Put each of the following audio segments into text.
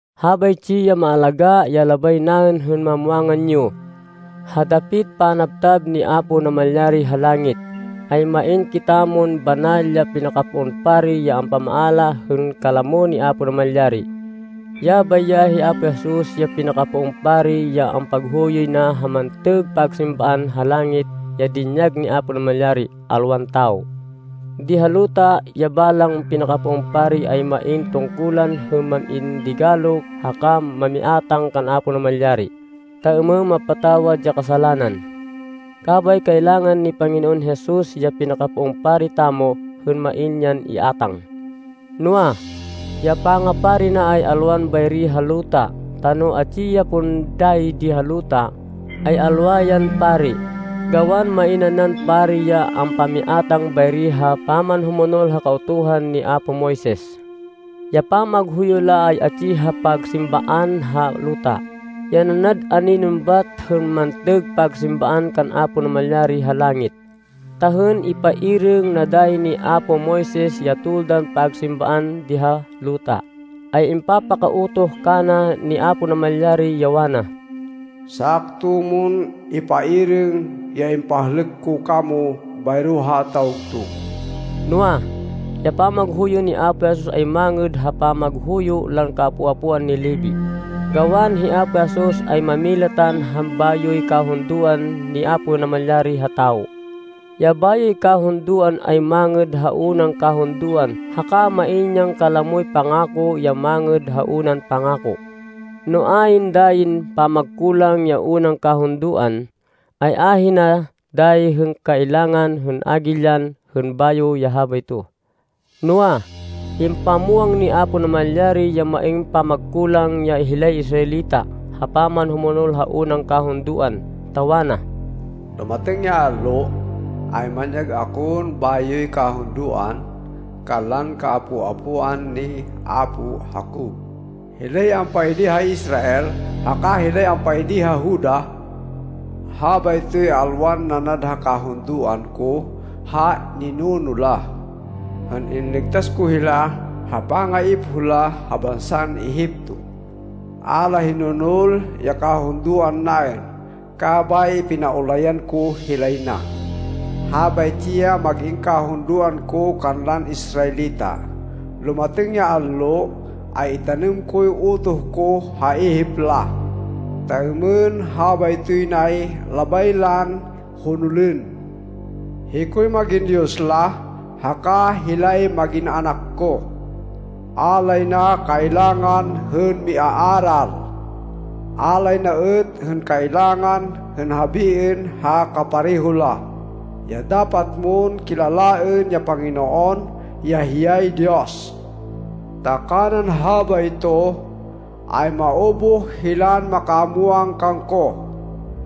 Habaytsi ya maalagá ya labay naên hên mamwangan yo: ha dapit panabtab ni Apo Namalyari ha langit, ay main kitamon banal ya pinakapoon pari ya ampamaala hên kalamo ni Apo Namalyari. Yabay ya hi Apo Jesus ya pinakapoon pari ya ampaghuyoy na ha mantêg pagsimbaan ha langit ya dinyag ni Apo Namalyari, alwan tawo. Di ha luta, ya balang pinakapoon pari, ay main tungkulan hên mam-in digalo haka mamiátang kan Apo Namalyari, ta êmên mapatawad ya kasalanan. Kabay kailangan ni Panginoon Jesus, ya pinakapoon pari tamo, hên main yan iátang. Noa, ya pangapari na ay alwan bayri ha luta, ta no atsi ya pon dayi di ha luta, ay alwa yan pari, gawan main nanan pari ya ampamiátang bayri ha pamanhumonol ha Kautuhan ni apo Moises. Ya pamaghuyo la ay atsi ha pagsimbaan ha luta, ya nanad aninon bat hên mantêg pagsimbaan kan Apo Namalyari ha langit. Ta hên ipairêng na dayi ni apo Moises ya toldan pagsimbaan di ha luta, ay impapaka-utoh kana ni Apo Namalyari, ya wana, “Sakto mon ipairêng ya impahlêk ko kamo bayro ha tawgtug.” Noa, ya pamaghuyo ni Apo Jesus ay mangêd ha pamaghuyo lan kaapo-apoan ni Levi, gawan hi Apo Jesus, ay mámilatan ha bayoy kahundoan ni Apo Namalyari ha tawo. Ya bayoy kahundoan ay mangêd ha unan kahundoan haka main yan kalamoy pangako ya mangêd ha unan pangako. No ayn dayin pamagkulang ya unan kahundoan, ay ahina dayi hên kailangan hên hagilyan hên bayo ya habayto. Noa, impamwang ni Apo Namalyari ya main pamagkulang ya hilay Israelita ha pamanhumonol ha unan kahundoan, ta wana, “Lumatêng ya allo, ay manyag akon bayoy kahundoan kanlan kaapo-apoan ni apo Jacob, hilay ampaidi ha Israel haka hilay ampaidi ha Juda. Habaytoy alwan nanad ha kahundoan ko ha ninuno la, hên inligtas ko hila ha pangaipoh la ha bansan Egipto. A la hinonol ya kahundoan naên, kabay pinaulayan ko hilay na. Habaytsi ya mag-in kahundoan ko kanlan Israelita, lumatêng ya allo, ay itanêm koy utoh ko ha ihip la, ta êmên habaytoy nay labay lan honolên. Hikoy mag-in Diyos la, haka hilay mag-in anak ko. A lay na kailangan hên miaaral. A lay na êt hên kailangan hên habiên ha kapareho la, ya ‘Dapat mon kilalaên ya Panginoon, ya hiyay Diyos.’ Ta kanan habayto ay maubuh hilan makamwang kangko,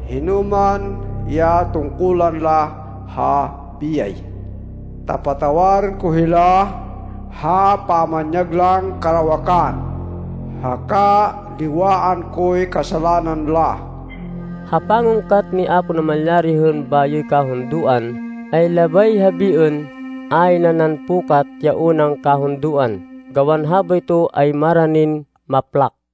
hinoman ya tungkulan la ha biyay. Ta patawarên ko hila ha pamanyag lan karawakan, haka liwaan koy kasalanan la.” Ha pangungkat ni Apo Namalyari hên bayoy kahundoan, ay labay habiên, ayn nanan pukat ya unan kahundoan, gawan habayto ay maranin maplak.